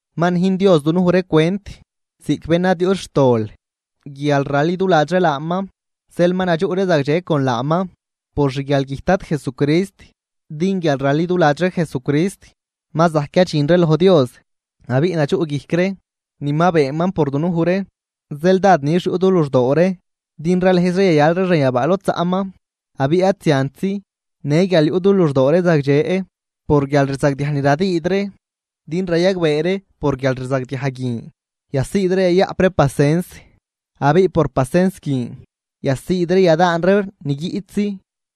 Ma nüjn Dios dunuj ree cwent ziꞌc bén ad yuꞌt xtol guial raliduladx ree laaman, zeel ma nadxuꞌ ree zagdxe con laaman por xguialgüjt Dad Jesucrist. Din guial raliduladx ree Jesucrist ma zajc yadxin ree loj Dios abiꞌ nadxuꞌguijc ree ni ma beenman por dunuj ree, zeel dád nix yuꞌ du luxdoo ree din ralëëz ree yayal ree xanyabaa lod zaꞌman. Abiꞌ ad ziantzi, në guial yuꞌ du luxdoo ree zagdxe por guialrzagdiaj ni radüüd ree, din rayagbee ree por guialrzagdiaj guin yasiid ree yayaꞌp ree pasens. Abiꞌ por pacens guin yasiid ree yadaan ree ni guiꞌtzi,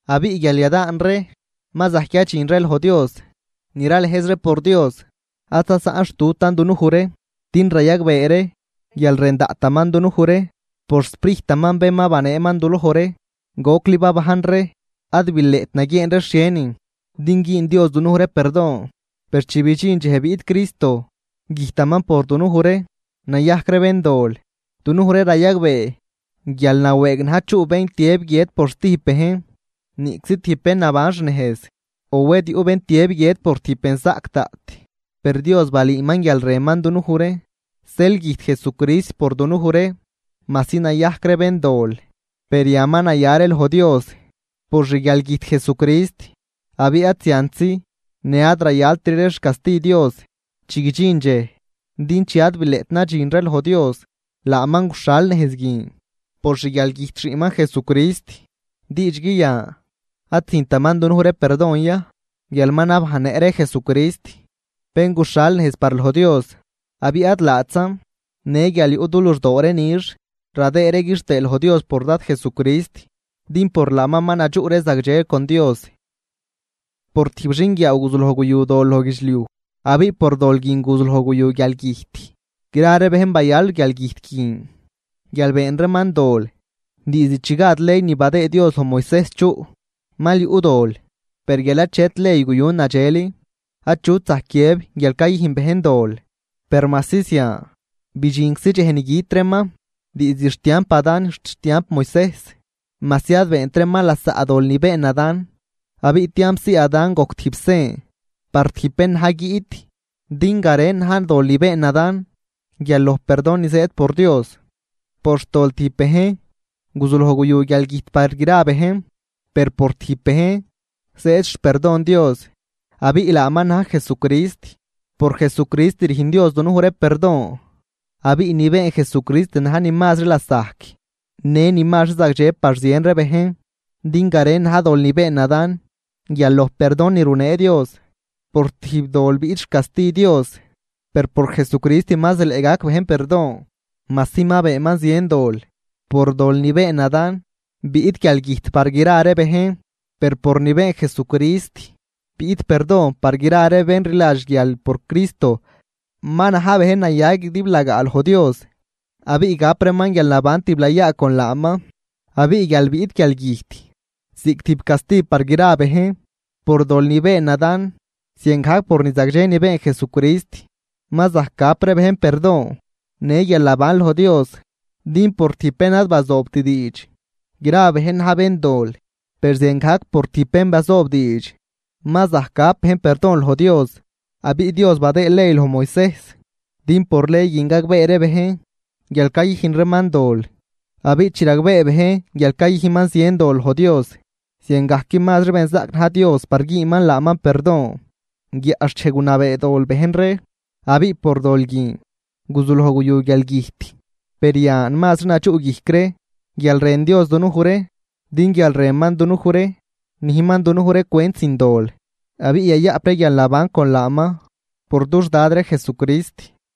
abiꞌ guial yadaan ree ma zajc yadxin ree loj Dios. Ni ralëëz ree por Dios, ad zasaꞌnxtutan dunuj ree, din rayagbee ree guial rën daꞌtaman dunuj ree por xSprijtaman bén ma baneeman duloj ree. Gocli babajn ree ad bileꞌt naguieen ree xhienin din güün Dios dunuj ree perdon. Per chi bidxin dxej biꞌt Cristo güjtaman por dunuj ree nayajc ree béndol. Dunuj ree rayagbee guial nawëëg na̱j chuꞌ bén tiëb guiët por zatijb bejn. Niꞌczi por tijb bén naban xnejz, o wed yuꞌ bén tiëb guiët por tijb benzaꞌc daꞌt. Per Dios ma balüüman guial rënman dunuj ree, zeel güjt Jesucrist por dunuj ree majsi nayajc ree béndol. Per yan ma naya ree loj Dios por xguialgüjt Jesucrist, abiꞌ ad ziantzi, në ad zayaltri ree xcasti Dios chi guidxin dxej. Din chi ad bileꞌt nadxin ree loj Dios, laaman guxhal nejz guin por xguialgüjt Xiꞌnman Jesucrist, diidxgui yan ad züjntaman dunuj ree perdon ya, guial ma nabajnnëꞌ ree Jesucrist, bén guxhal nejz par loj Dios. Abiꞌ ad laatzan, në guial yuꞌ du luxdoo ree nix radëëd ree quixtëë loj Dios por Dad Jesucrist, din por laaman ma nadxuꞌ ree zagdxe con Dios. Por tijb xinguiaaw guzuloj guyu dol loj guidxliuj, abiꞌ por dol guin guzuloj guyu guialgüjt, gra ree bejn bayal guialgüjt guin guial been reeman dol. Diizd chi gad ley ni badëëd Dios loj Moisejs chuꞌ mal yuꞌ dol, per guial achet ley guyu nadxel, achut zajc guiëb guial cayüjn bejn dol. Per majsi zian, bidxinczi dxej ni güt reeman, diizd xtiamp Adán xt xtiamp Moisejs, majsi ad beent reeman lasaꞌ dol ni been Adán. Abiꞌ tiampzii Adán gojc tijb sen par tijb bén na̱j guiꞌt. Din garen na̱j dol ni been Adán guial loj perdon ni zëëd por Dios. Por xtol tijb bejn guzuloj guyu guialgüjt par gra bejn, per por tijb bejn zëëd xperdon Dios, abiꞌ laaman na̱j Jesucrist. Por Jesucrist rüjn Dios dunuj ree perdon, abiꞌ ni been Jesucrist na̱j ni mazri lasajc, në ni mazri zagdxe par zien ree bejn. Din garen na̱j dol ni been Adán guial loj perdon ni runee Dios. Por tijb dol biꞌt xcasti Dios, per por Jesucrist ma zileꞌ gac bejn perdon, majsi ma beenman zien dol. Por dol ni been Adán biꞌt guialgüjt par gra ree bejn. Per por ni been Jesucrist biꞌt perdon par gra ree bén rliladx guial por Cristo ma na̱j bejn naya guidiblagaa loj Dios, abiꞌ gap reeman guialnaban tiblayaa con laaman. Abiꞌ guial biꞌt guialgüjt ziꞌc tijb casti par gra ree bejn por dol ni been Adán, ziangajc por ni zagdxe ni been Jesucrist ma zajc gap ree bejn perdon në guialnaban loj Dios. Din por tijb bén ad bazoobt diidx gra bejn na̱j béndol. Per ziangajc por tijb bén bazoob diidx ma zajc gap bejn perdon loj Dios. Abiꞌ Dios badëë ley loj Moisejs, din por ley guin gagbee ree bejn guial cayüjn reeman dol. Abiꞌ chi ragbee bejn guial cayüjnman zien dol loj Dios, ziangajc mazri benzaꞌc na̱j Dios par güünman laaman perdon. Guiaꞌxchej gunabee dol bejn ree, abiꞌ por dol guin guzuloj guyu guialgüjt. Per yan mazri nadxuꞌguijc ree guial rën Dios dunuj ree, din guial rënman dunuj ree nüjnman dunuj ree cwent sin dol, abiꞌ yayaꞌp ree guialnaban con laaman por dux Dad ree Jesucrist.